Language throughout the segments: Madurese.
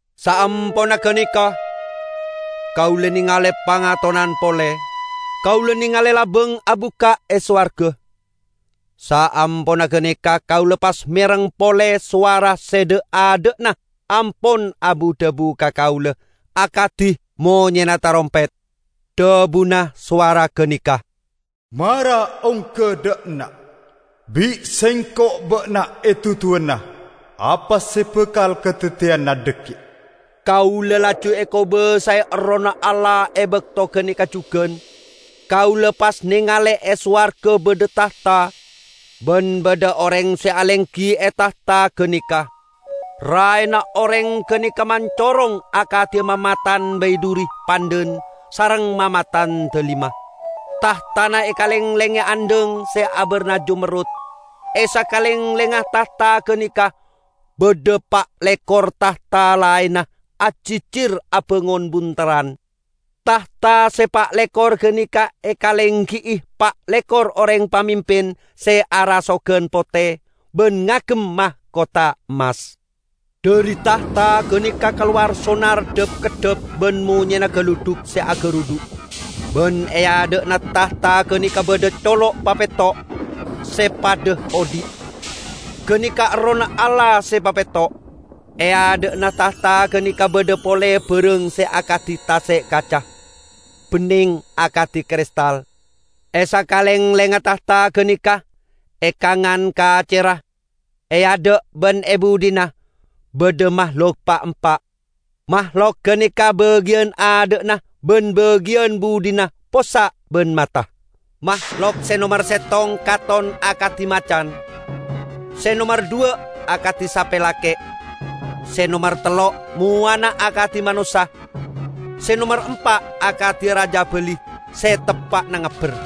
Saamponna ganeka kaula nengale pangatonan pole. Kaula nengale labang abukka' e sowarga. Saamponna ganeka kaula pas mereng pole sowara se dha'-adha'na ampon abu-dhabu ka kaula akadi monyena tarompet. Dhabuna sowara ganeka, "Mara ongga dha' enna'. Bi' Sengko' ba'na eduduwana apa se bakal kadaddiyana dhaggi'." Kaula laju ekobasae Errohna Allah e bakto ganeka jugan. Kaula pas nengale e sowarga badha tahta, ban badha oreng se alenggi e tahta ganeka. Raena oreng ganeka mancorong akadi mamatan baidhuri pandhan sareng mamatan dalima. Tahtana ekalenglenge andhang se abarna jamerrut. E sakalenglengnga tahta ganeka badha pa' lekor tahta laenna, ajijir abangon bunterran. Tahta se pa' lekor ganeka ekalenggi'i pa' lekor oreng pamimpin se arasogan pote ban ngagem makotha emmas. Dhari tahta ganeka kalowar sonar dhap-keddhap ban monyena galudhuk se agarudhu'. Ban e adha'na tahta ganeka badha colok papetto', se padha odhi'. Ganeka Errohna Allah se papetto'. E adha'na tahta ganeka badha pole barang se akadi tase' kaca, benneng akadi kristal. E sakalenglengnga tahta ganeka, e kangan kacerra, e adha' ban e budhina, badha mahlok pa'-empa'. Mahlok ganeka bagiyan adha'na ban bagiyan budhina possa' ban mata. Mahlok se nomer settong katon akadi macan. Se nomer dhuwa' akadi sape lake'. Se nomer tello' mowana akadi manossa. Se nomer empa' akadi rajabali se teppa'na ngabber.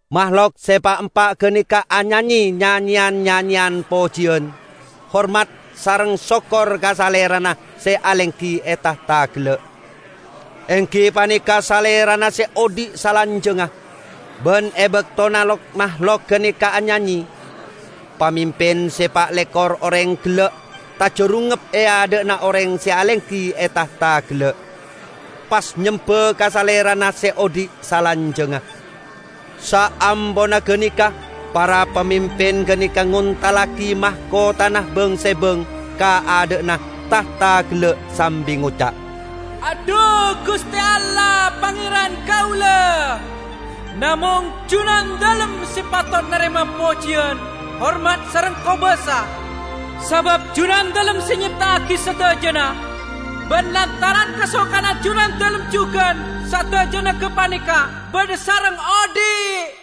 Mahlok se pa'-empa' ganeka anyanye nyanyeyan-nyanyeyan pojiyan, hormat sareng sokkor ka Salerana se alenggi e tahta gella', enggi paneka Salerana se odhi' salanjangnga. Ban e baktona lok-mahlok ganeka anyanye, pamimpin se pa' lekor oreng gella' tajarungngep e adha'na oreng se alenggi e tahta gella', pas nyemba ka Salerana se odhi' salanjangnga. Saamponna ganeka para pamimpin ganeka ngontallagi makothana bang-sebang ka adha'na tahta gella' sambi ngoca', "Adhu, Guste Allah, Pangeran kaula! Namong Junandalem se patot narema pojiyan, hormat sareng kobasa. Sabab Junandalem se nyepta'agi sadajana, ban lantaran kasokanna Junandalem jugan sadajana gapaneka badha sareng odhi'."